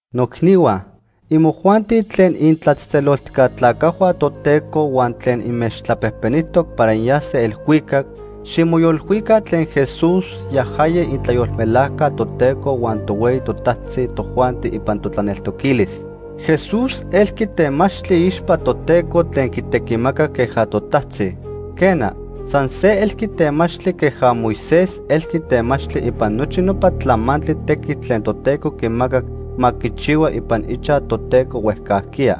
Noicnihua, imojuanti tlen initlatzejtzeloltijca tlacajhua Toteco huan tlen inmechtlapejpenijtoc para inyase elhuicac, ximoyolilhuica tlen Jesús, yajaya itlayolmelajca Toteco huan tohueyi totajtzi tojuanti ipan totlaneltoquilis. Jesús elqui temachtli iixpa Toteco tlen quitequimacac queja totajtzi. Quena, san se elqui temachtli queja Moisés elqui temachtli ipan nochi nopa tlamantli tequitl tlen Toteco quimacac ma quichihua ipan ichaj Toteco huejcajquiya.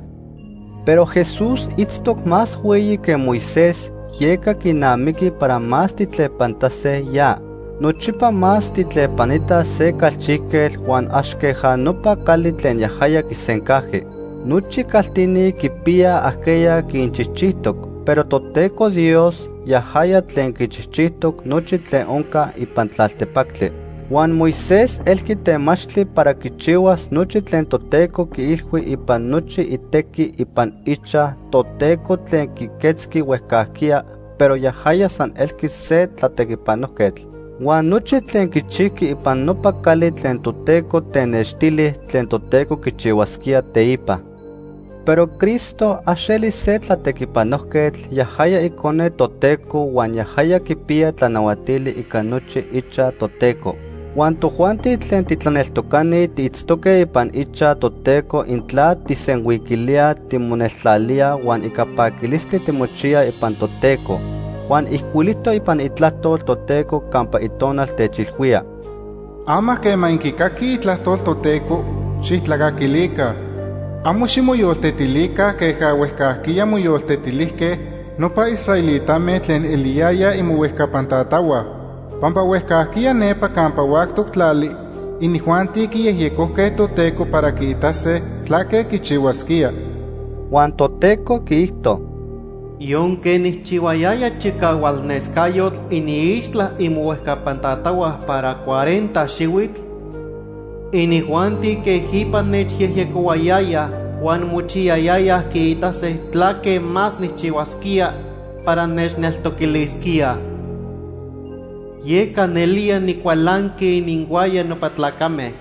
Pero Jesús itztoc más hueyi que Moisés, yeca quinamiqui para más tijtlepanitase ya. Nochipa más tijtlepanitaj se calchijquetl huan ax queja nopa cali tlen yajaya quisencajqui. Nochi caltini quipiyaj ajqueya quinchijchijtoc, pero Toteco Dios, yajaya tlen quichijchijtoc nochi tlen onca ipan tlaltepactli. Huan Moisés elqui temachtli para quichihuas nochi tlen Toteco quiilhui ipan nochi itequi ipan ichaj Toteco tlen quiquetzqui huejcajquiya, pero yajaya san elqui se tlatequipanojquetl. Huan nochi tlen quichijqui ipan nopa cali tlen Toteco tenextili tlen Toteco quichihuasquía teipa. Pero Cristo, ax eli se tlatequipanojquetl, yajaya Icone Toteco huan yajaya quipiya tlanahuatili ica nochi ichaj Toteco. Huan tojuanti tlen titlaneltocani tiitztoque ipan ichaj Toteco intla tijsenhuiquilíaj timoneltlalíaj huan ica paquilistli timochiyaj ipan Toteco. Huan ijcuilijtoc ipan Itlajtol Toteco campa Itonal techilhuía: “Ama quema inquicaquij itlajtol Toteco, xijtlacaquilica. Amo ximoyoltetilica queja huejcajquiya moyoltetilijque nopa israelitame tlen eliyayaj imohuejcapan tatahua. Pampa huejcajquiya nepa campa huactoc tlali inijuanti quiyejyecojque Toteco para quiitase tlaque quichihuasquía.” (Huan Toteco quiijto:) “Yonque nijchihuayaya chicahualnescayotl iniixtla imohuejcapan tatahua para cuarenta xihuitl, inijuanti quejipa nechyejyecohuayayaj huan mochiyayayaj quiitase tlaque más nijchihuasquía para nechneltoquilisquíaj. Yeca nelía nicualanqui ininhuaya nopa tlacame,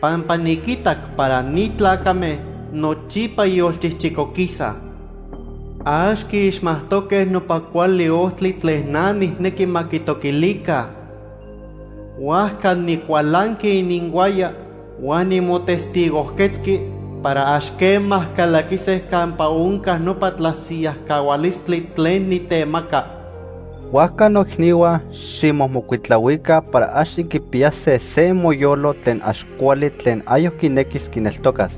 pampa niquitac para ni tlacame nochipa yolchijchicoquisaj. Ax quiixmajtoque nopa cuali ojtli tlen na nijnequi ma quitoquilica. Huajca nicualanqui ininhuaya huan nimotestigojquetzqui para ax quema calaquise campa onca nopa tlasiyajcahualistli tlen nitemaca.” Huajca noicnihua, ximomocuitlahuica para ax inquipiyase se imoyolo tlen ax cuali tlen ayoc quinequis tlaneltocas.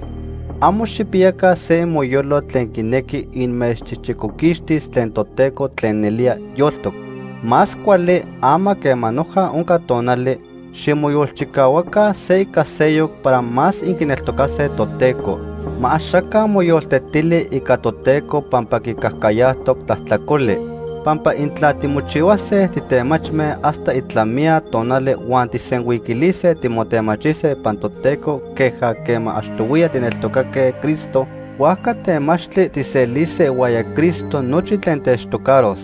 Amo xijpiyaca se imoyolo tlen quinequi inmechchijchicoquixtis tlen Toteco tlen nelía yoltoc. Más cuali, ama quema noja onca tonali, ximoyolchicahuaca se ica seyoc para más inquineltocase Toteco. Ma axaca moyoltetili ica Toteco pampa quicajcayajtoc tlajtlacoli. Pampa intla timochihuase titemachme hasta itlamiya tonali huan tijsenhuiquilise timotemachise ipan Toteco queja quema achtohuiya tijneltocaque Cristo, huajca temachtli tijselise ihuaya Cristo nochi tlen techtocaros.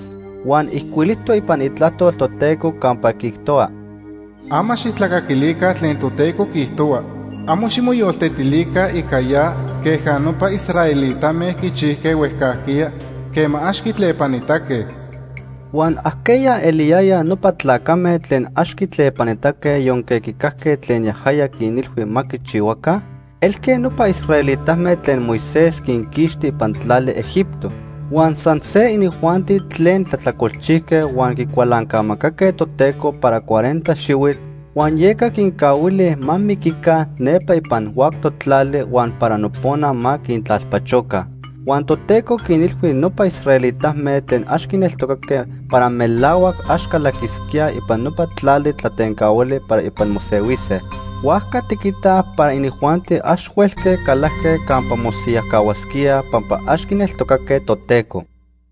Huan ijcuilijtoc ipan Itlajtol Toteco campa quiijtohua: “Ama xijtlacaquilica tlen Toteco quiijtohua. Amo ximoyoltetilica ica ya queja nopa israelitame quichijque huejcajquiya quema ax quitlepanitaque.” Huan ¿ajqueya eliyayaj nopa tlacame tlen ax quitlepanitaque yonque quicajque tlen yajaya quinilhui ma quichihuaca? Elque nopa israelitame tlen Moisés quinquixti ipan tlali Egipto. Huan san se inijuanti tlen tlajtlacolchijque huan quicualancamacaque Toteco para cuarenta xihuitl, huan yeca quincahuili ma miquica nepa ipan huactoc tlali huan para nopona ma quintlalpachoca. Huan Toteco quinilhui nopa israelitame tlen ax quineltocaque para melahuac ax calaquisquíaj ipan nopa tlali tlatencahuali para ipan mosehuise. Huajca tiquitaj para inijuanti ax huelque calajque campa mosiyajcahuasquíaj pampa ax quineltocaque Toteco.